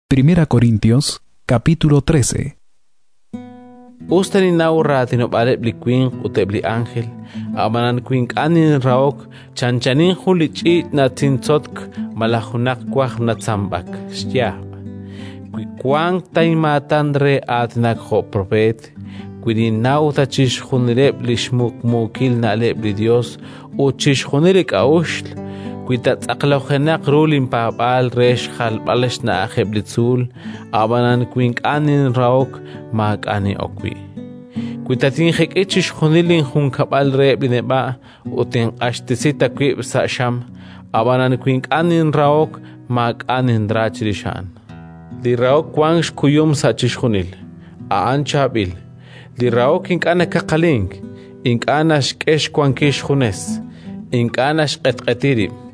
Li rahok a'an q'axal loq' Us ta ninnaw raatinob'aaleb' li winq ut eb' li ánjel, ab'anan wi ink'a' ninrahok, chanchanin jun li ch'iich' natzintzotk malaj junaq wajb' natzanb'ak xyaab'. Wi wank ta inmaatan re aatinak jo' propeet, wi ninnaw ta chixjunileb' li xmuqmuukil na'leb' li Yos ut chixjunil li k'a'uxl, wi ta tz'aqlojenaq ru linpaab'aal re xjalb'al xna'aj eb' li tzuul, ab'anan wi ink'a' ninrahok, maak'a' nin'ok wi'. Wi ta tinjek'i chixjunil linjunkab'lal reheb' li neb'a' ut tinq'axtesi ta wib' sa' xam, ab'anan wi ink'a' ninrahok, maak'a' ninra chirix a'an. Li rahok wank xkuyum sa' chixjunil; a'an chaab'il. Li rahok ink'a' nakaqalik, ink'a' naxk'e xwankil xjunes, ink'a' naxq'etq'eti rib',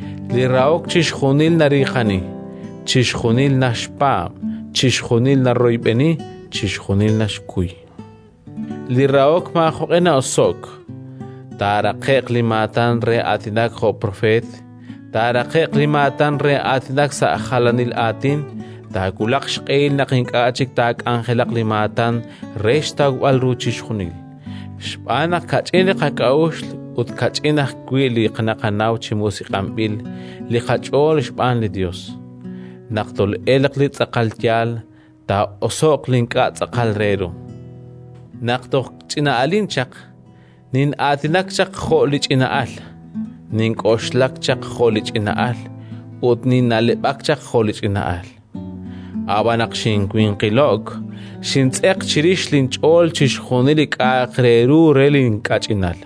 Li rahok chixjunil nariiqani, chixjunil naxpaab', chixjunil naroyb'eni, chixjunil naxkuy. Li rahok maajoq'e na'oso'k. Taaraqe'q li maatan re aatinak jo' propeet, taaraqe'q li maatan re aatinak sa' jalanil aatin. Taawulaq xq'ehil naq ink'a' chik taak'anjelaq li maatan re xtawb'al ru chixjunil. Xb'aan naq kach'in li qak'a'uxl ut kach'in ajwi' li naqanaw chi musiq'anb'il li qach'ool xb'aan li Yos. Naq tol'elq li tz'aqal yaal, taa'oso'q li ink'a' tz'aqal re ru. Naq toj ch'ina'alin chaq, nin'aatinak jo' li ch'ina'al, nink'oxlak jo' li ch'ina'al ut ninna'leb'ak jo' li ch'ina'al. Ab'an naq xinwinqilo'k, xintz'eq chirix linch'ool chixjunil li k'a'aq re ru re li kach'inal.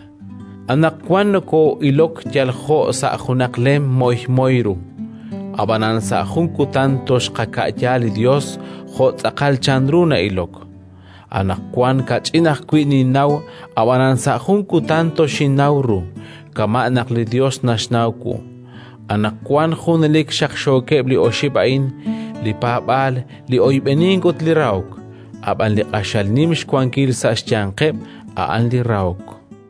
Anaqwan nokoo'ilok yal jo' sa' junaq lem moymoy ru, ab'anan sa' jun kutan toxqaka'ya li Yos jo' tz'aqal chanru na'ilok. Anaqwan kach'in ajwi' ninnaw, ab'anan sa' jun kutan toxinnaw ru, kama' naq li Yos naxnaw wu. Anaqwan junelik xaqxookeb' li oxib' a'in: li paab'aal, li oyb'enink ut li rahok. Ab'an li q'axal nim xwankil sa' xyanqeb', a'an li rahok.